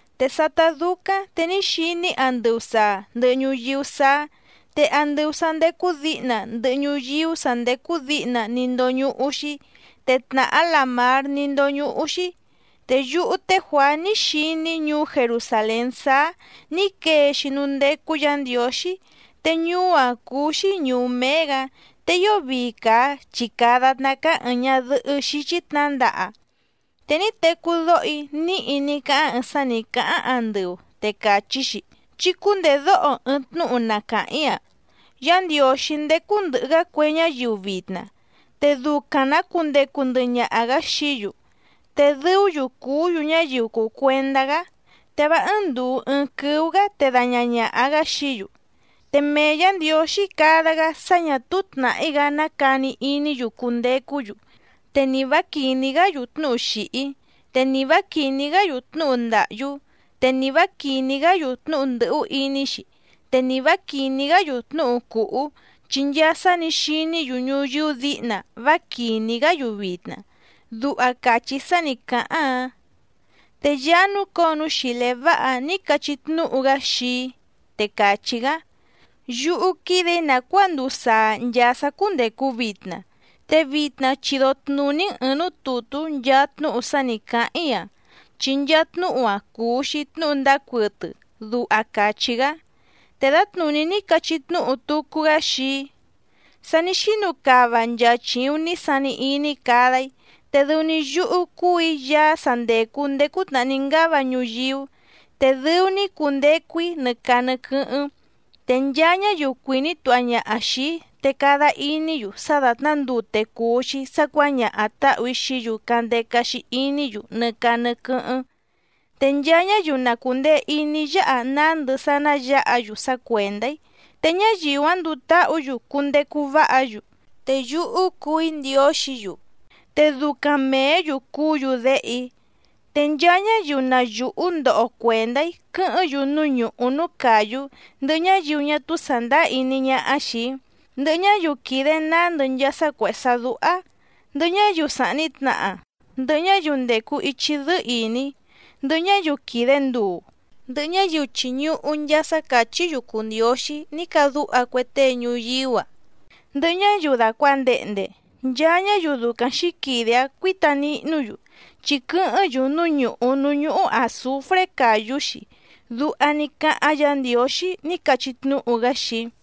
Te sátá dúcáⁿ te ní xiní‑í andɨu sàa ndɨhɨ ñuyíú sáá, te andɨu sǎ ndécú dǐhna ndɨhɨ ñuyíú sà ndécú dǐhna ní ndóñúhú‑xí, te tnàhá làmár ní ndóñúhú‑xí. Te yúhú té Juàá ní xiní‑í ñuú Jerusàlén sáá nǐ quee‑xi núú ndécú Yǎ Ndiǒxí, te ñuú‑áⁿ cúú‑xí ñùú méé‑gǎ, te ío vii càa chi càa datná cáá ɨ̀ɨⁿ ñadɨhɨ́ xíchí tnǎndaha. Te ní tecú dóho‑í níhi ní cáháⁿ ɨɨⁿ sá nǐ cáháⁿ andɨu, te càchí‑xi: —Chí cúndèdóho ɨɨⁿ tnúhu na càháⁿ‑í‑a: Yá Ndiǒxí ndécú ndɨ̀hɨ‑gá cue ñáyiu vitna, te ducaⁿ‑nǎ cundecu ndɨhɨ ñaha‑gǎ xií‑yu, te dɨú‑yu cùú‑yu ñáyiu cùu cuendá‑gá, te vá ɨ́ɨ́ⁿ ndùu ɨɨⁿ quɨ́ú‑gǎ te daña ñàha‑gá xií‑yu. Te mee Yǎ Ndiǒxí cada‑gá sá ñà túú tnàhí‑gá ná cani iní‑yu cundecú‑yu, te ni vǎ quìní‑gá‑yu tnúhu xìhí, te ni vǎ quìní‑gá‑yu tnúhu ndàhyú, te ni vǎ quìní‑gá‑yu tnúhu ndɨ̀hú iní‑xi, te ni vǎ quìní‑gá‑yu tnúhu cùhú, chi nchaa sá nǐ xiní‑yu ñuyíú dǐhna vá quìní‑gá‑yu vitna —duha càchí sá nǐ cáháⁿ‑áⁿ. Te Yaá núcǒo núú xìlé váha‑áⁿ nǐ cachí tnúhu‑gá xii‑í, te càchí‑gá: —Yúhú quídè‑í nàcuáa nduu saa nchàa sá cúndècu vitna. Te vitna chido tnùní‑n ɨ̀ɨⁿ núú tùtú nchaa tnúhu sá nǐ cáháⁿ‑í‑a, chi nchaa tnúhu‑a cùu‑xi tnúhu ndáá cuɨtɨ —duha càchí‑gá. Te dǎtnùní ní cachí tnúhu tucu‑gá xii‑í: —Sa ní xínu cava nchaa chìuⁿ ní sani iní‑í cada‑í, te dɨu‑ni yúhú cúù‑í Yaá sa ndècu ndéé cútnàhá ní ngáva ñuyíú, te dɨu‑ni‑í cundecu‑í nɨ caa nɨ quɨ́hɨ́ⁿ. Te nchaa ñáyiu cuìní tuha ñaha xìi‑í te cada iní‑yu sá dàtná ndute cùu‑xi sá cuǎñaha tǎhù‑í xií‑yu candeca‑xi iní‑yu nɨ caa nɨ quɨ́hɨ́ⁿ. Te nchaa ñáyiu na cùndee iní yáha nándɨ sá ná yǎha‑yu sá cuèndá‑í, te ñáyiu‑áⁿ nduu táhǔ‑yu cundecu váha‑yu, te yúhú cuu‑í Ndiǒxǐ‑yu, te ducaⁿ mèé‑yu cuú‑yu déhe‑í. Te nchaa ñáyiu na yùhú ndoho cuèndá‑í quɨ́hɨ́ⁿ‑yu núú ñùhú núú càyú ndɨhɨ ñáyiu ñá túú sàndáá iní ñáhá xìi‑í, ndɨhɨ ñáyiu quìde nándɨ nchaa sá cuèhé sá dúhá, ndɨhɨ ñáyiu sàhni tnaha, ndɨhɨ ñáyiu ndècu ichi dɨ́ɨ́ ìní, ndɨhɨ ñáyiu quìde nduu, ndɨhɨ ñáyiu chìñuhu nchaa sá càchí‑yu cùu ndióxí ní cadúha cue tée ñuyíú‑a, ndɨhɨ ñáyiu dàcuandehnde, nchaa ñáyiu ducaⁿ xǐquide‑áⁿ cuǐta nihnú‑yu chi quɨ́hɨ́ⁿ‑yu núú ñùhú núú ñúhú àzufré càyú‑xi —duha ní cáháⁿ Yǎ Ndiǒxí ní cachí tnúhu‑gá xii‑í.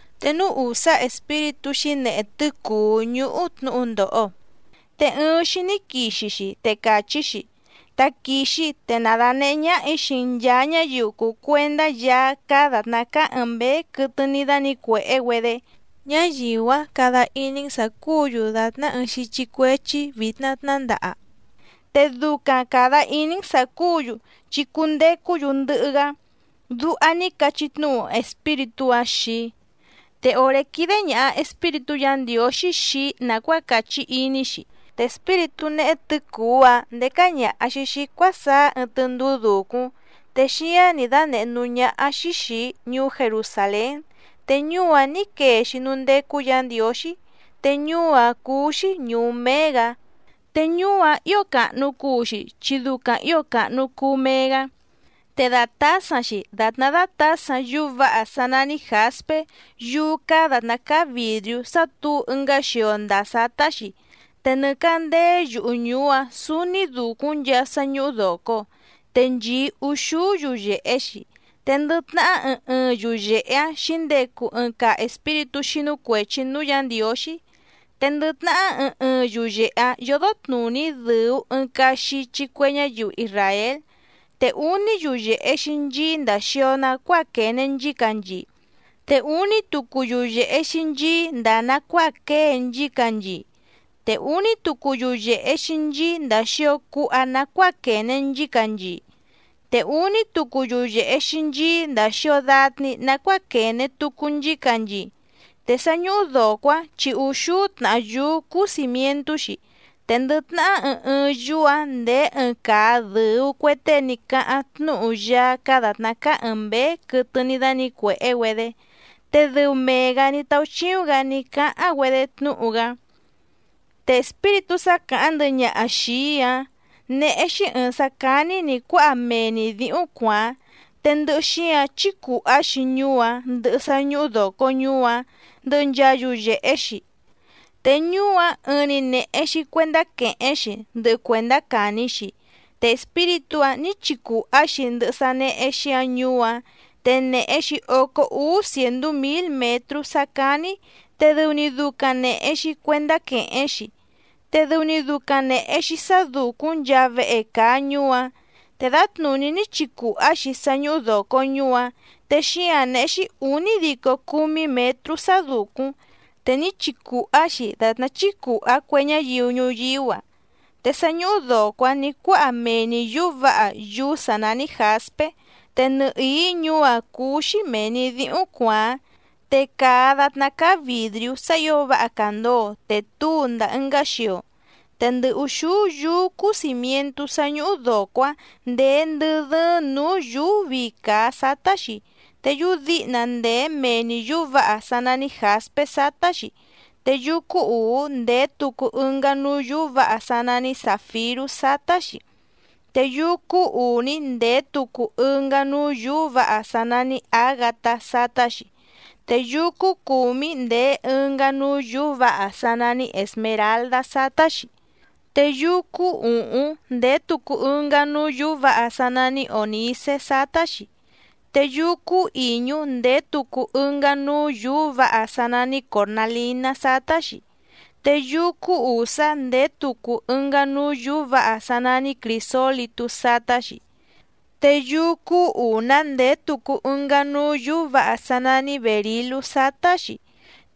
Te núú ùsá espíritú xǐnehe tɨ́cùú ñúhú tnǔhu ndòho, te ɨɨⁿ‑xi ní quixi‑xi te càchí‑xi: —Taquìxi, te na dànehé ñáhà‑í xii‑n nchàa ñáyiu cùu cuendá Yaá cáá dàtná cáá ɨ̀ɨⁿ mbéé quɨtɨ ní dánǐcuèhé‑güedé, ñáyiu‑áⁿ cada iní‑n sǎ cúǔ‑yu dàtná ɨɨⁿ xíchí cuéchí vìtna tnándaha, te ducaⁿ càda iní‑n sǎ cúǔ‑yu chi cundecú‑yu ndɨhɨ‑gá —duha ní cachí tnúhu espíritú‑áⁿ xii‑í. Te òré quídé ñàha espíritú Yǎ Ndiǒxí xii‑í nàcuáa càchí iní‑xi, te espíritú néhé tɨ̌cùú‑áⁿ ndécá ñàha‑xi xii‑í cuásaá ɨɨⁿ tɨndúú dùcúⁿ, te xíáⁿ nǐ dánèhé núú ñáhá‑xí xìi‑í ñuú Jerusàlén te ñuú‑áⁿ nǐ quee‑xi núú ndécú Yǎ Ndiǒxí, te ñuú‑áⁿ cúú‑xí ñùú méé‑gǎ. Te ñuú‑áⁿ ǐo càhnu cuu‑xi chi ducaⁿ ǐo càhnu cuu mee‑gá, te dàtásaⁿ‑xi dàtná dátǎsaⁿ yúú vǎha sá nání jǎspé yúú cáá dàtná cáá vìdriú sá tǔu ɨngá xio ndàa sátá‑xi. Te nɨ càndéé yuhu ñùú‑áⁿ sǔúní dùcúⁿ nchaa sá ñúhú dòco, te nchìí úxúú yuyèhe‑xi, te ndɨ tnahá ɨɨⁿ ɨɨⁿ yuyèhe‑áⁿ xǐndecu ɨɨⁿ caa espíritú xínú cuèchi núú Yǎ Ndiǒxí. Te ndɨ tnahá ɨɨⁿ ɨɨⁿ yuyèhe‑áⁿ yódó tnùní dɨ̀u ɨɨⁿ caa xichi cue ñáyiu isràél. Te úní yuyèhe‑xi nchií ndàa xio nacuáa quène nchícanchii, te úní tucu yuyèhe‑xi nchií ndàa nacuáa quée nchícanchii, te úní tucu yuyèhe‑xi nchií ndàa xio cuha nacuáa quène nchícanchii, te úní tucu yuyèhe‑xi nchií ndàa xio datni nacuáa quène tucu nchícanchii. Te sá ñúhú dòco‑áⁿ chi úxúú tnàhá yúú cúú cìmientú‑xi, te ndɨ tnahá ɨɨⁿ ɨɨⁿ yúú‑ǎⁿ ndèé ɨɨⁿ caa dɨ̀u cue tée ní cáháⁿ tnúhu Yaá cáá dàtná cáá ɨ̀ɨⁿ mbéé quɨtɨ ní dánǐcuèhé‑güedé, te dɨu mee‑gǎ ní táúchíúⁿ‑gǎ ní cáháⁿ‑güedé tnúhu‑gá. Te espíritú sá càháⁿ ndɨhɨ ñaha xìi‑í‑áⁿ néhé‑xí ɨ̀ɨⁿ sá cání nǐ cuáha mee‑ni dǐhúⁿ cuàáⁿ, te ndɨhɨ xíǎⁿ chícùhá‑xi ñuú‑áⁿ, ndɨhɨ sá ñúhú dòco ñuú‑áⁿ, ndɨhɨ nchaa yuyèhe‑xi. Te ñuú‑áⁿ ɨɨⁿ‑ni nèhe‑xi cuendá quèhéⁿ‑xi ndɨhɨ cuèndá càni‑xi, te espíritú‑ǎⁿ ní chicùhá‑xi ndɨhɨ sá néhé‑xí‑ǎⁿ ñuú‑áⁿ, te nèhe‑xi ócó úú cièndú mǐl mětrú sá cání te dɨu‑ni ducaⁿ nèhe‑xi cuendá quèhéⁿ‑xi, te dɨu‑ni ducaⁿ nèhe‑xi sá dùcúⁿ nchaa vehe càa ñuú‑áⁿ. Te dǎtnùní ní chicùhá‑xi sá ñúhú dòco ñuú‑áⁿ, te xíǎⁿ néhé‑xí ǔnídico cúmí mětrú sá dùcúⁿ, te ní chicùhá‑xi dàtná chícùhá cue ñáyiu ñuyíú‑a. Te sá ñúhú dòco‑áⁿ nǐ cuáha mee‑ni yǔú vǎha yúú sǎ nání jǎspé, te nɨhìí ñuú‑áⁿ cúú‑xí mèe‑ni díhúⁿ cuàáⁿ, te càa datná cáá vìdriú sá ǐo váha càndoo te túu ndàa ɨngá xio. Te ndɨ ùxúú yúú cúú cìmientú sá ñúhú dòco‑áⁿ ndèé ndɨ́ dɨ́ɨ́ⁿ nǔú yùú vii càa sátá‑xi, te yúú dǐhna ndèé mee‑ni yǔú vǎha sá nání jǎspé sátá‑xi, te yúú cúú ùú ndèé tucu ɨngá núú yǔú vǎha sá nání zàfirú sátá‑xi, te yúú cúú ùní ndèé tucu ɨngá núú yǔú vǎha sá nání ǎgatá sátá‑xi, te yúú cúú cùmí ndèé ɨngá núú yǔú vǎha sá nání èsmeraldá sátá‑xi. Te yúú cúú ùhúⁿ ndèé tucu ɨngá núú yǔú vǎha sá nání ònícé sátá‑xi, te yúú cúú ìñú ndèé tucu ɨngá núú yǔú vǎha sá nání còrnalíná sátá‑xi, te yúú cúú ùsá ndèé tucu ɨngá núú yǔú vǎha sá nání crìsólitú sátá‑xi, te yúú cúú ùná ndèé tucu ɨngá núú yǔú vǎha sá nání bèrilú sátá‑xi,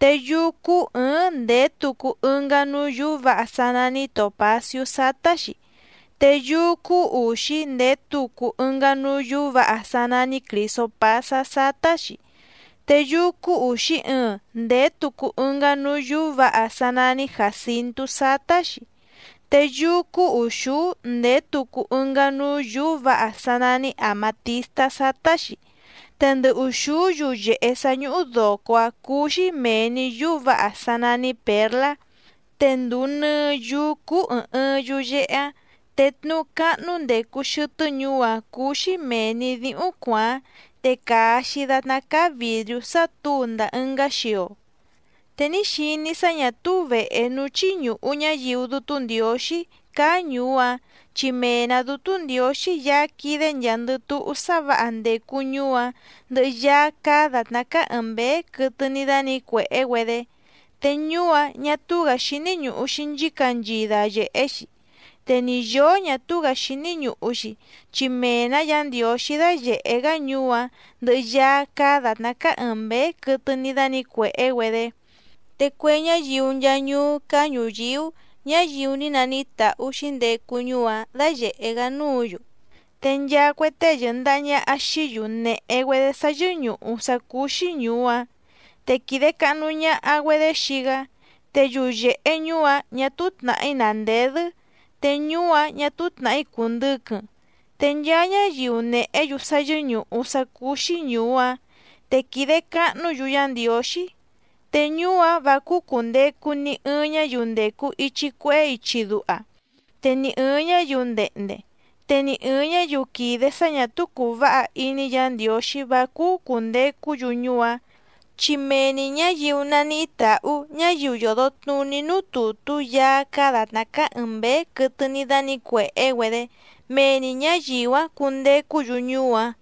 te yúú cúú ɨ̀ɨ́ⁿ ndèé tucu ɨngá núú yǔú vǎha sá nání tòpacíú sátá‑xi, te yúú cúú ùxí ndèé tucu ɨngá núú yǔú vǎha sá nání crìsopásá sátá‑xi, te yúú cúú ùxí ɨɨⁿ ndèé tucu ɨngá núú yùú vǎha sá nání jàcintú sátá‑xi, te yúú cúú ùxúú ndèé tucu ɨngá núú yǔú vǎha sá nání àmatístá sátá‑xi. Te ndɨ ùxúú yuyèhe sá ñúhú dòco‑áⁿ cúú‑xí mèe‑ni yúú vǎha sá nání pěrlá, te ndùu nɨɨ yúú cúú ɨ̀ɨⁿ ɨɨⁿ yuyehe‑áⁿ. Te tnuú cáhnú ndècu xɨtɨ́ ñuú‑áⁿ cúú‑xí mèe‑ni díhúⁿ cuàáⁿ, te càa‑xi datná cáá vìdriú sá tǔu ndàa ɨngá xio. Te ní xiní‑í sá ñà túú vèhe núú chíñùhu ñáyiu Dútú Ndiǒxí cáá ñùú‑áⁿ, chi mee‑nǎ Dútú Ndiǒxí Yaá quídé nchàa‑ndɨ túhú sá vǎha ndècu ñuú‑áⁿ, ndɨhɨ Yaá cáá dàtná cáá ɨ̀ɨⁿ mbéé quɨtɨ ní dánǐcuèhé‑güedé. Te ñuú‑áⁿ ñà túú‑gǎ xíní ñùhu‑xi nchícanchii dayèhé‑xi, te ni yǒó ñà túú‑gǎ xíní ñùhu‑xi, chi mee‑nǎ Yǎ Ndiǒxí dáyèhé‑gá ñuú‑áⁿ ndɨhɨ Yaá cáá dàtná cáá ɨ̀ɨⁿ mbéé quɨtɨ ní dánǐcuèhé‑güedé. Te cue ñáyiu nchaa ñuú cáá ñùyíú, ñáyiu ní naníhí tàhú xǐndecu ñuú‑áⁿ dáyèhé‑gá núǔ‑yu, te nchaa cue tée yɨ̀ndaha ñaha xií‑yu nèhe‑güedé sá yɨ́ñùhu sá cúú‑xí ñùú‑áⁿ, te quìde cahnu ñaha‑güedé xii‑gá. Te yuyèhe ñuú‑áⁿ ñà túú tnàhí nàndedɨ́, te ñuú‑áⁿ ñà túú tnàhí cùndɨquɨⁿ. Te nchaa ñáyiu nèhé‑yu sá yɨ́ñùhu sá cúú‑xí ñùú‑áⁿ te quìde cahnú‑yu Yá Ndiǒxí. Te ñuú‑áⁿ vǎ cúú cùndecu ni ɨɨⁿ ñáyiu ndècu ichi cuehé ichi duha, te ni ɨ̀ɨⁿ ñáyiu ndehnde, te ni ɨ̀ɨⁿ ñáyiu quìde sá ñà túú cùu váha iní Yǎ Ndiǒxí vá cúú cùndecú‑yu ñuú‑áⁿ, chi mee‑ni ñǎyiu naníhí tàhú ñáyiu yòdo tnuní núú tùtú Yaá cáá dàtná cáá ɨ̀ɨⁿ mbéé quɨtɨ ní dánǐcuèhé‑güedé, mee‑ni ñǎyiu‑áⁿ cundecú‑yu ñuú‑áⁿ.